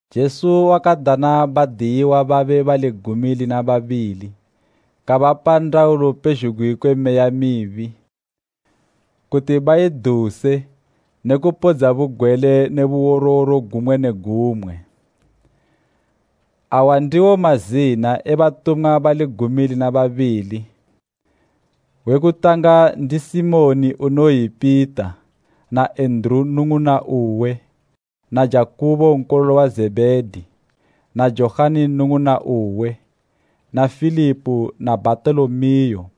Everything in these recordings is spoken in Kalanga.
Jesu wakadana badiyiwa babe bali gumi lina babili kabapa ndaulo pezhugwi kwe meya mibi, kuti baiduse ne kupodza bugwele ne buworoworo gumwe ne gumwe. Awa ndiwo mazina e batumwa bali gumi lina babili. We kutanga ndi Simoni iye unoyi Pita na Enduru nnung'una uwe na Jakubo nkololo wa Zebhedi na Johani nnung'una uwe, na Filipo na Bhatolomeo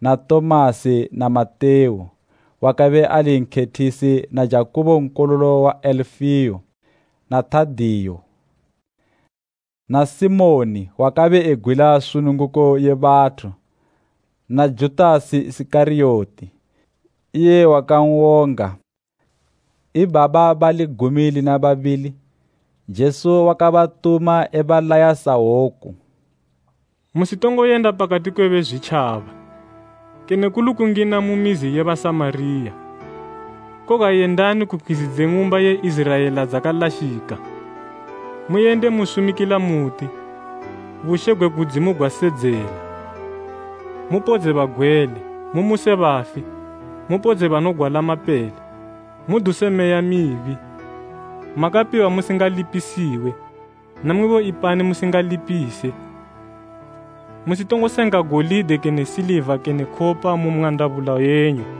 na Tomasi na Matewu wakabe ali nkhethisi na Jakubo nkololo wa Alifeo na Tadeo na Simoni wakabe egwila sununguko ye bathu na Judasi Isikariyoti, iye wakawonga Jesu. Ibaba bali gumi lina babili, Jesu wakabatuma ebalaya sahwoku, “Musitongoyenda pakati kwe Bezwitjaba kene kuli kungina mu mizi ye Basamariya. Koga yendani ku pkhwizi dze ng'umba ye Iziraela dzakalashika. Muyende musumikila muti, ‘Bushe gwe kudzimu gwasedzela.’ Mupodze bagwele, mumuse bafi, mupodze banogwala mapele. Muduse meya mibi. Makapiwa musingalipisiwe, namwibo ipani musingalipise. Musitongosenga golide kene siliva kene khopa mu mwandabula yenyu.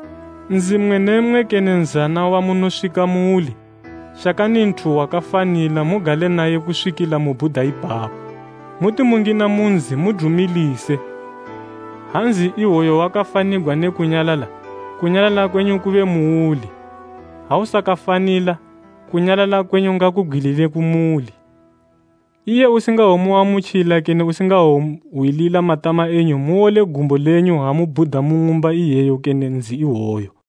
“Nzi mmwe ne mmwe kene nzana wamunoswika muuli, shakani nthu wakafanila mugale naye kuswikila mubhuda ipapo. Muti mungina mu nzi mudumilise. Ha nzi iwoyo wakafanigwa nge kunyalala, kunyalala kwenyu kube muuli, ha usakafanila, kunyalala kwenyu ngakubgwilile kumuli. Iye usingawomuamutjila kene usingawohwilila matama enyu muwole gumbo lenyu ha mubhuda mu ng'umba iyeyo kene nzi iwoyo.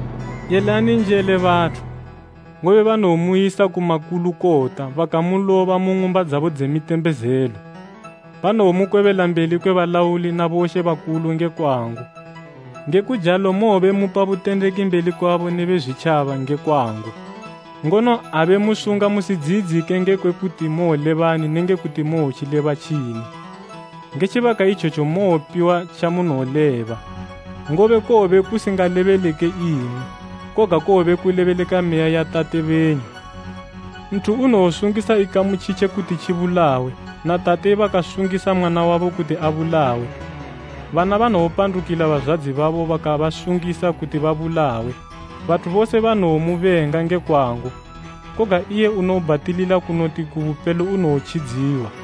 Yelani njele bathu, ngobe banowomuyisa ku makulukota bakamuloba mu ng'umba dzabo dze mitembezelo, banowomukwebela mbeli kwe balauli na bomambo nge kwangu. Ngekujalo mowobe mupa butendeki mbeli kwabo ne Bezwitjaba nge kwangu. Ngono ha bemusunga musidziyidzike ngekwe kuti mowolebani nenge kuti mowotjileba tjini. Nge tjibaka itjetjo mowopiwa tjamunowoleba, ngobe kowobe kusingalebeleke imwi, koga kowobe kulebeleka Meya ya Tate benyu. “Nthu unowosungisa ikamu tjitje kuti tjibulawe na tate bakasungisa mwana wabo kuti abulawe, bana banowopandukila bazwadzi babo bakabasungisa kuti babulawe. Bathu bose banowomubenga nge kwangu, koga iye unobhatilila kunoti ku bupelo unowotjidziwa.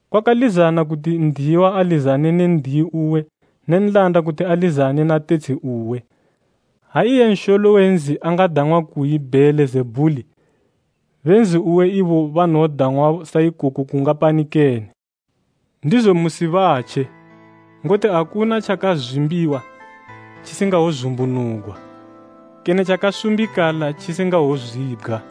Kwakalizana kuti n'diyiwa alizane ne n'diyi uwe ne nlanda kuti alizane na tetshi uwe. Ha iye nsholo we nzi akadang'wa kuyi Bheelizebhuli, be nzi uwe ibo banowodang'wa saikoko kungapani kene! “Ndizo musibatje, ngoti akuna tjakazwimbiwa tjisingawozumbunugwa kene tjakasumbikala tjisingawozibgwa.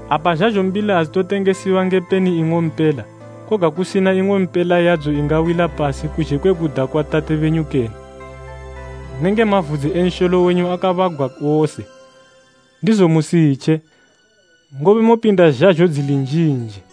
Apa zhazho mbili adzitotengesiwa nge peni ing'ompela, koga kusina ing'ompela yadzo ingawila pasi kuzhe kwe kuda kwa Tate benyu kene. Nenge mavudzi e nsholo wenyu akabagwa wose. Ndizo musitje, ngobe mopinda zhazho dzili njinji.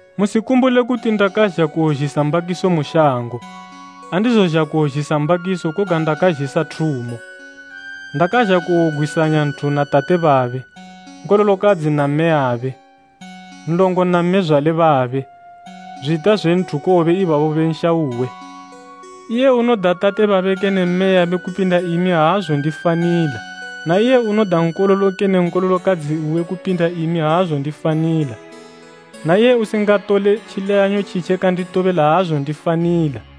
“Musikumbule kuti ndakazha kuwozhisa mbakiso mu shango. Aandizozha kuwozhisa mbakiso koga ndakazhisa thumo. Ndazha kuwogwisanya nthu na Tate babe, nkololokadzi na mmeyabe, nlongo na mmezwale babe zwita zwe nthu kowobe ibabo be nsha uwe! “Iye unoda tate babe kene mmeyabe kupinda imi aazondifanila na iye unoda nkololo kene nkololokadzi uwe kupinda imi aazondifanila. Na iye usingatole tjileyanyo tjitje kanditobela aazondifanila.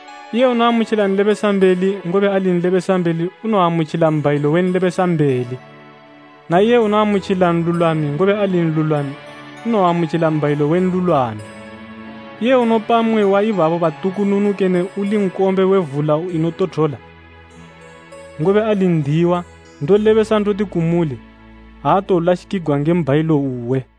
Iye unoamutjila nlebesambeli, ngobe ali nlebesambeli unowoamutjila mbhayilo we nlebesambeli, na iye unoamutjila nlulwami, ngobe ali nlulwami, unowoamutjila mbhayilo we nlulwami. Iye unopa mmwe wa ibaba batukununu kene uli nkombe we vula inotothola, ngobe ali n'diyiwa, ndolebesa ndoti kumuli, aatowolashikigwa nge mbhayilo uwe.”